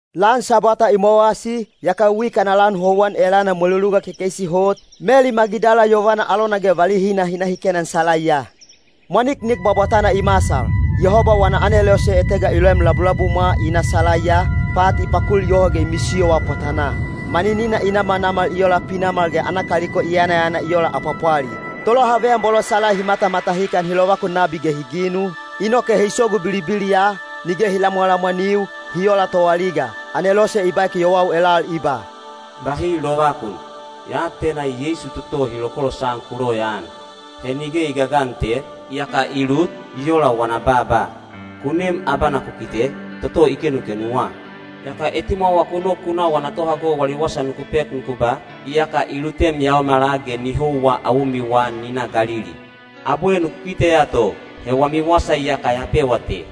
Lan Sabwata i mowasi, yaka wik ana lan houwan elana mweluluga kekeisi hot, Meli Magidala yovana alona ge valihina hi na hi kenan salaiya. Mwaniknik bwabwatana i masal. Yehoba wana anelose etega i loem labulabumwa i na salaiya, pat i pakul yoho ge i misiyowa pwatanaa. Maninina i namanamal i ola pinamal ge ana kaliko i yanayana i ola apwapwali. Tolohaveyan bolo salai hi matamatahikan hi lovakun nabi ge hi ginu, inoke hi sogu bilibiliya, nige hi lamwalamwaniu, hi ola toaliga. Anelose i baek yowau elal i ba, “Bahi lovakun! Ya atena Yeisu toto hi lokolosan ku loyaan. He nige i gagan te, iyaka i lut, i ola wana baaba. Ku nem abana ku kite, toto i kenukenuwa. Yaka etimwawa ku nok ku na wana tohago wali wasa nuku pek nuku ba, ‘Iyaka i lutem yaomala ge ni houwa awomiwa ni na Galili. Abwe nuku kiteya to.’ He wami wasa iyaka ya pewa te.”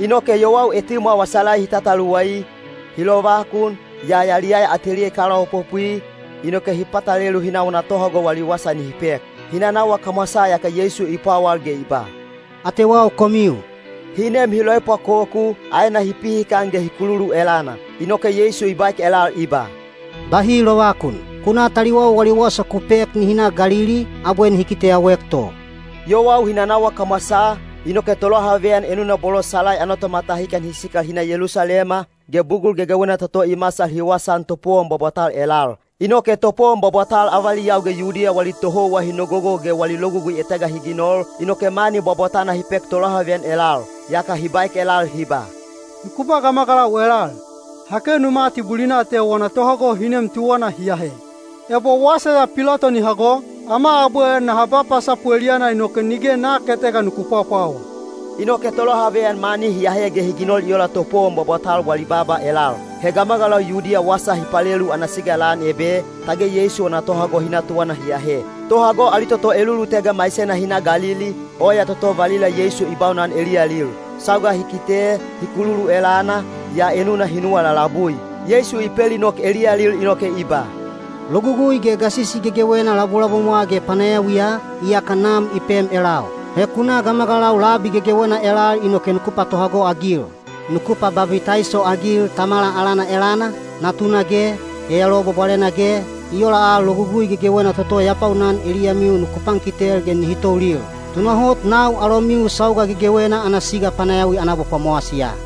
Inoke yowau etimwawa salai hi tataluwai, hi lovakun, yaa yaliyaya ateliya i kalaopopwi, inoke hi patalelu hi na wana tohago wali wasa nihi pek. Hi nanawa kamwasaa yaka Yeisu i pwawal ge i ba, “Atewau komiu.” Hi nem hi loepwakoku, aena hi pihikan ge hi kululu elana. Inoke Yeisu i baek elal i ba, “Bahi lovakun! Ku na taliwau wali wasa ku pek nihi na Galili, abwe nihi kiteyauek to.” Yowau hi nanawa kamwasaa, inoke tolohaveyan enuna bolo salai ana tomatahikan hi sikal hi na Yelusalema, ge bugul gegewena toto i masal hi wasaan topowon bwabwatal elal. Inoke topowon bwabwatal avaliyau ge Yudiya wali tohouwa hi nogogo ge wali logugui etega hi ginol, inoke mani bwabwatana hi pek tolohaveyan elal. Yaka hi baek elal hi ba, “Nuku ba gamagalau elal, ‘Ha kenu mati bulina te wana tohago hi nem tuwana hi ahe.’ Ebo wasa ya Pilato ni hago, ama abwe naha ba pasapu eliyana inoke nige nak etega nuku pwapwawa.” Inoke tolohaveyan mani hi ahe ge hi ginol i ola topowon bwabwatal wali baaba elal. He gamagalau Yudiya wasa hi palelu ana siga lan ebe, tage Yeisu wana tohago hi na tuwana hi ahe. Tohago ali toto elulutega maisena hi na Galili, oya toto valila Yeisu i baunan eliyalil. Sauga hi kite, hi kululu elana, yaa enuna hi nuwa lalabui. Yeisu i pelinok eliyalil inoke i ba, “Logugui ge gasisi gegewena labulabumwa ge panayawiya, iyaka Nam i pem elau. He ku na gamagalau labi gegewena elal inoke nuku patohago-agil: nuku pababitaiso-agil Tamala alana elana, Natuna ge, Yayaluwa Bwabwalena ge, i ola al logugui gegewena toto ya baunan eliyamiu nuku pankitel ge nihi toulil. Tunahot nau alomiu sauga gegewena ana siga panayawi ana abapwamowasiya.”